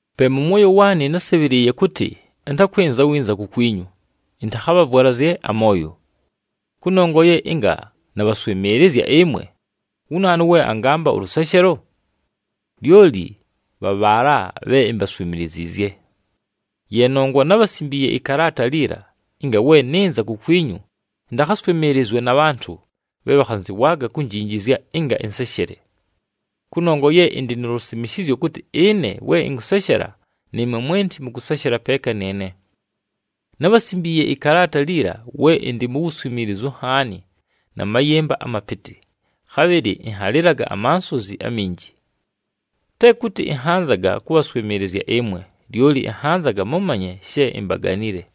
Pe mʉ mwoyo waanɨ násɨbhɨlɨɨye kʉtɨ, ɨntakwɨnza winza kukwinyu, ɨntakhabhavwalazye amooyo. Kʉnongwa ye ɨnga nabhaswɨmɨɨlɨzya ɨmwe, wu naanu we angampa ʉlʉseshelo? Lyoli bha bhaala bhe imbaswimiliziizye! Ye nongwa nábhasimbiiye ɨkalaata liila, ɨnga we nɨnza kukwinyu ɨntakhaswɨmɨɨlɨzwe na bhantʉ bhe bhakhanzɨwaaga kunjinjizya ɨnga ɨnseshele. Kʉnongwa ye ɨndɨ nu lusimishizyo kʉtɨ ɨne we ɨnkʉseshela, nɨɨmwe mwenti mʉkʉseshela peeka nɨɨne. Nábhasimbiiye ɨkalaata liila we ɨndɨ mu wuswimiilizu nhaani na mayɨmba amapɨtɨ, khabhɨlɨ ɨnhalɨlaga amansozi aminji. Te kʉtɨ ɨnhanzaga kʉbhaswɨmɨɨlɨzya ɨmwe, lyoli ɨnhanzaga mʉmanye she imbaganile.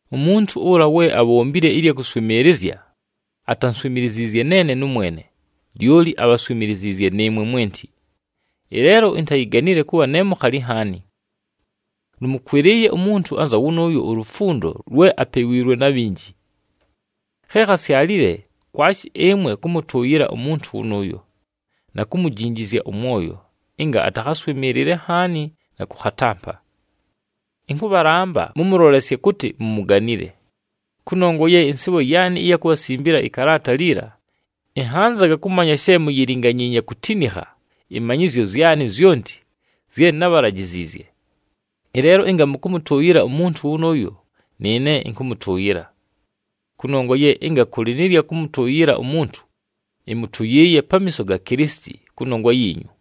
Umuntu ʉla we abhombile ɨlya kʉswɨmɨɨlɨzya, atanswimiliziizye neene nʉmwene, lyoli abhaswimiliziizye nɨɨmwe mwenti. Ɨleelo intayiganile kʉbha ne mukhali nhaani. Lʉmʉkwɨlɨɨye umuntu anza wʉnʉʉyo ulufundo lwe apewiilwe na bhinji. Khe khasyalile, kwashi ɨmwe kʉmʉtʉʉyɨla umuntu wʉnʉʉyo, na kumujinjizya ʉmwoyo ɨnga atakhaswɨmɨɨlɨle nhaani na kʉkhatampa. Ɨnkʉbhalamba mʉmʉlolesye kʉtɨ mumuganile. Kʉnongwa ye ɨnsɨɨbho yaanɨ ɨya kubhasimbila ɨkalaata liila, ɨnhanzaga kʉmanya she muyilinganyiinye kutinikha ɨmanyɨzyo zyanɨ zyonti zye nábhalajiziizye. Ɨleelo ɨnga mʉkʉmʉtʉʉyɨla umuntu wʉnʉʉyo, nɨɨne ɨnkʉmʉtʉʉyɨla. Kʉnongwa ye ɨnga kʉlɨ nɨ lya kʉmʉtʉʉyɨla umuntu, ɨmʉtʉyɨɨye pamiiso ga Kilisiti kʉnongwa yiinyu,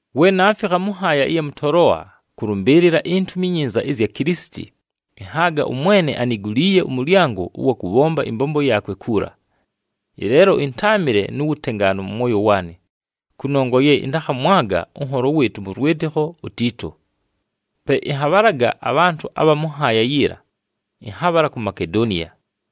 We naafikha mʉ nhaaya ɨya mʉ Toloa kʉlʉmbɨɨlɨla iNtumi iNyinza ɨzya Kilisiti, ɨnhaaga ʉMwene aniguliiye ʉmʉlyango ʉwa kʉbhomba ɨmbombo yaakwe kuula. Ɨleelo ɨntáamɨle nu wutengaanu mʉ mwoyo waanɨ, kʉnongwa ye ɨntakhamwaga ʉnholo wɨɨtʉ mʉ lwɨtɨkho uTiito. Pe ɨnhabhalaga abhantʉ abha mʉ nhaaya yiila, ɨnhabhala ku Makedoniya.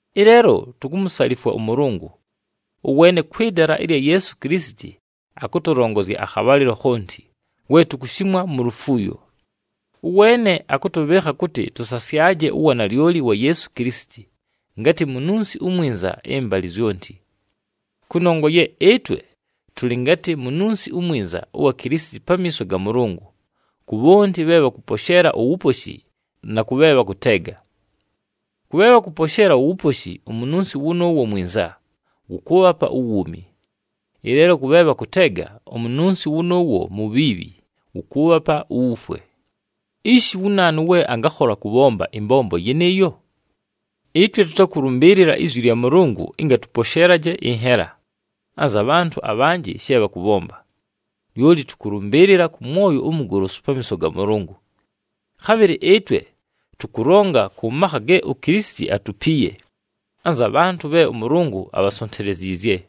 Ɨleelo tukumusalifwa ʉMʉlʉngʉ! Ʉweene kwɨ dala ɨlya Yeesu Kilisiti akʉtʉlongozya akhabhalɨlo khonti, we tukushimwa mu lufuuyo. Ʉweene akʉtʉbhɨɨkha kʉtɨ tʉsasyaje uwanalyoli wa Yeesu Kilisiti, ngatɨ mununsi umwinza ɨmbalɨ zyonti. Kʉnongwa ye ɨtwe tʉlɨ ngatɨ mununsi umwinza ʉwa Kilisiti pamiiso ga Mʉlʉngʉ, ku bhonti bhe bhakʉposheela uwuposhi na kʉ bhe bhakʉteega. Kʉ bhe bhakʉposheela uwuposhi, umununsi wʉnʉʉwo mwinza, wʉkʉʉbhapa uwuumi. Ɨleelo kʉ bhe bhakʉteega, umununsi wʉnʉʉwo mubhiibhi, wʉkʉʉbhapa uwufwe. Ishi wu naanu we angakhola kʉbhomba ɨmbombo yɨnɨɨyo? Ɨtwe tʉtakʉlʉmbɨɨlɨla izwi lya Mʉlʉngʉ ɨnga tʉposheelaje ɨnhela, anza bhantʉ abhanjɨ she bhakʉbhomba. Lyoli tʉkʉlʉmbɨɨlɨla kʉ mwoyo umugolosu pamiiso ga Mʉlʉngʉ. Khabhɨlɨ ɨtwe tʉkʉlonga kʉ makha ge uKilisiti atupiiye anza bhantʉ bhe ʉMʉlʉngʉ abhasonteleziizye.